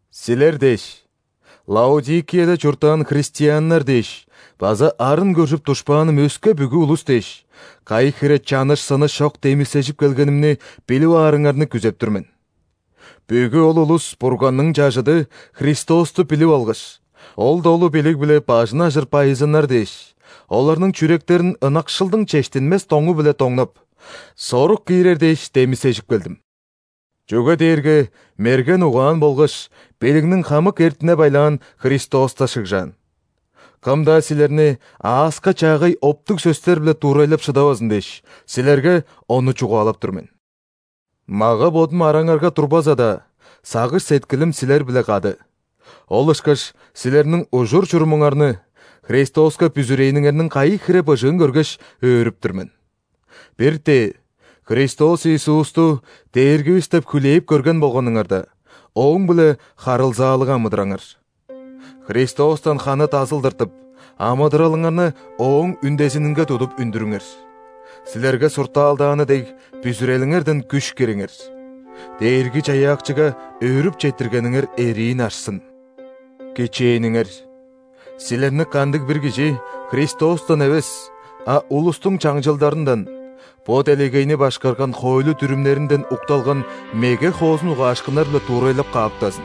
Силер дээш, Лаодикияда чурттаан христианнар дээш база арын көржүп душпааным өске бүгү улус дээш, кайы хире чаныш-сыныш чок демисежип келгенимни билип аарыңарны күзеп тур мен. Бүгү ол улус Бурганның чажыды – Христосту билип алгаш, ол долу билиг-биле бажын ажыр байызыннар дээш, оларның чүректерин ынакшылдың чештинмес доңу-биле доңнап, сорук киирер дээш демисежип келдим. Чүге дээрге мерген угаан болгаш билигниң хамык эртине-байлаан Христоста шыгжаан. Кым-даа силерни ааска чаагай оптуг сөстер-биле дуурайлап шыдавазын дээш, силерге ону чугаалап тур мен. Мага-бодум араңарга турбаза-даа, сагыш-сеткилим силер-биле кады. Ол ышкаш силерниң ужур-чурумуңарны, Христоска бүзүрээниңерниң кайы хире быжыын көргеш, өөрүп тур мен. Бир-тээ Христос Иисусту Дээргивис деп хүлээп көрген болганыңарда, Ооң-биле харылзаалыг амыдыраңар. Христостан ханы дазыл тыртып, амыдыралыңарны Ооң үндезининге тудуп үндүрүңер, силерге суртаалдааны дег, бүзүрелиңерден күш кириңер. Дээрги-Чаяакчыга өөрүп четтиргениңер эриин ашсын! Кичээниңер: силерни кандыг-бир кижи Христостан эвес, а улустуң чаңчылдарындан, бо делегейни башкарган хоойлу-дүрүмнеринден укталган меге хоозун угаашкыннар-биле дуурайлап кааптазын.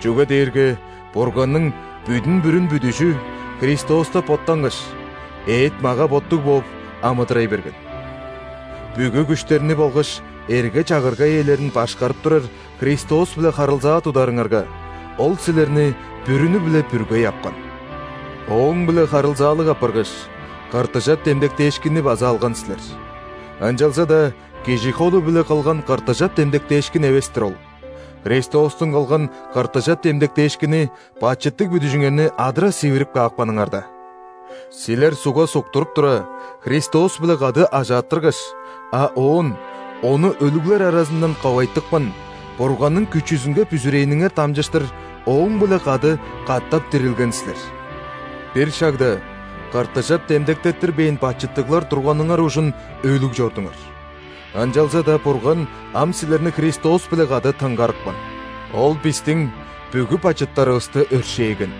Чүге дээрге Бурганның бүдүн-бүрүн бүдүжү Христоста боттангаш, эът-мага-боттуг бооп, амыдырай берген. Бүгү күштерни болгаш эрге-чагырга ээлерин башкарып турар Христос-биле харылзаа тударыңарга, Ол силерни бүрүнү-биле бүргей апкан. Ооң-биле харылзаалыг апаргаш, ·кыртыжап демдектээшкинни база алган силер. Ынчалза-даа кижи холу-биле кылган кыртыжап демдектээшкин эвес-тир ол – Христостуң кылган кыртыжап демдектээшкини бачыттыг бүдүжүңерни адыра сивирип каапканыңарда. Силер ·сугга суктуруп тура, Христос-биле кады ажааттыргаш, а оон Ону өлүглер аразындан ковайтыпкан Бурганның күчүзүнге бүзүрээниңер дамчыштыр Ооң-биле кады катап дирилген силер. Бир шагда кыртыжап демдектеттирбээн бачыттыглар турганыңар ужун өлүг чордуңар. Ынчалза-даа Бурган ам силерни Христос-биле кады тынгарыпкан. Ол бистиң бүгү бачыттарывысты өршээген.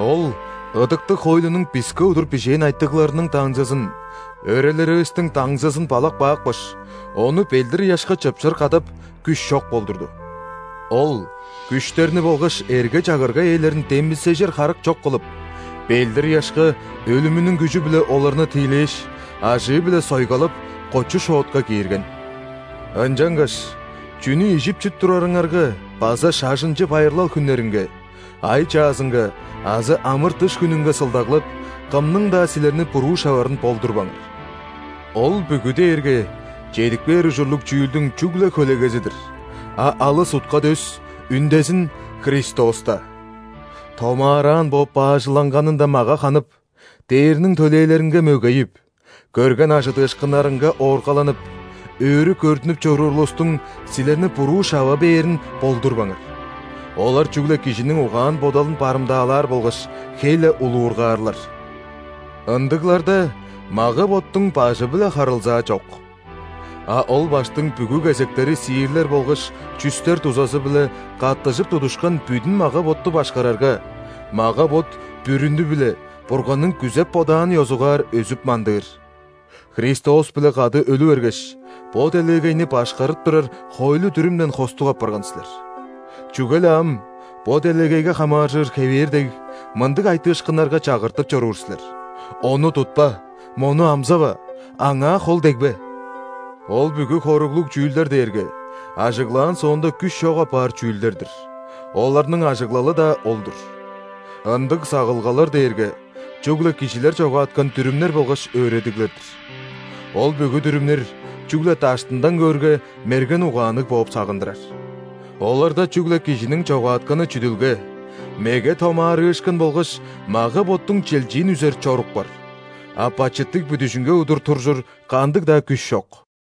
Ол ыдыктыг хоойлунуң биске удур бижээн айтыгларының даңзызын – өрелеривистиң даңзызын балап каапкаш, ону ·белдир-ыяшка чыпшыр кадап, күш чок болдурду. Ол күштерни болгаш эрге-чагырга ээлерин демисежир харык чок кылып, белдир-ыяшка өлүмүнүң күжү-биле оларны тиилээш, ажыы-биле сойгалап, кочу-шоотка киирген. Ынчангаш чүнү ижип-чип турарыңарга база шажынчы байырлал хүннеринге, ай чаазынга азы ·амыр-дыш хүнүнге сылдаглап, кымның-даа силерни буруу шаварын болдурбаңар. Ол бүгү дээрге чедип кээр ужурлуг чүүлдүң чүгле хөлегези-дир, а алыс утка-дөс, үндезин – Христоста! Томаараан бооп баажыланганындан мага ханып, ·дээрниң төлээлеринге мөгейип, көрген ·ажыдыышкыннарынга ооргаланып, өрү көрдүнүп чоруур улустуң силерни буруу шава бээрин болдурбаңар. Олар чүгле кижиниң угаан-бодалын барымдаалаар болгаш, хей-ле улуургаарлар. Ындыгларда мага-боттуң Бажы-биле харылзаа чок. А ол Баштың бүгү кезектери сиирлер болгаш чүстер дузазы-биле каттыжып тудушкан бүдүн мага-ботту башкарарга, мага-бот бүрүнү-биле Бурганның күзеп-бодаанын ёзугаар өзүп-мандыыр. Христос-биле кады өлү бергеш, бо делегейни башкарып турар хоойлу-дүрүмден хостуг апарган силер. Чүге-ле ам, бо делегейге хамааржыр хевээр дег, мындыг айтыышкыннарга чагыртып чоруур силер: «Ону тутпа!», «Мону амзава!», «Аңаа хол дегбе!» Ол бүгү хоруглуг чүүлдер дээрге ажыглаан соонда күш чок апаар чүүлдер-дир, оларның ажыглалы-даа ол-дур. Ындыг сагылгалар дээрге чүгле кижилер чогааткан дүрүмнер болгаш өөредиглер-дир! Ол бүгү дүрүмнер, чүгле даштындан көөрге, мерген угаанныг бооп сагындырар. Оларда чүгле кижиниң чогаатканы чүдүлге, меге томаарыышкын болгаш мага-боттуң чилчиин үзер чорук бар, а бачыттыг бүдүжүнге удур туржур кандыг-даа күш чок!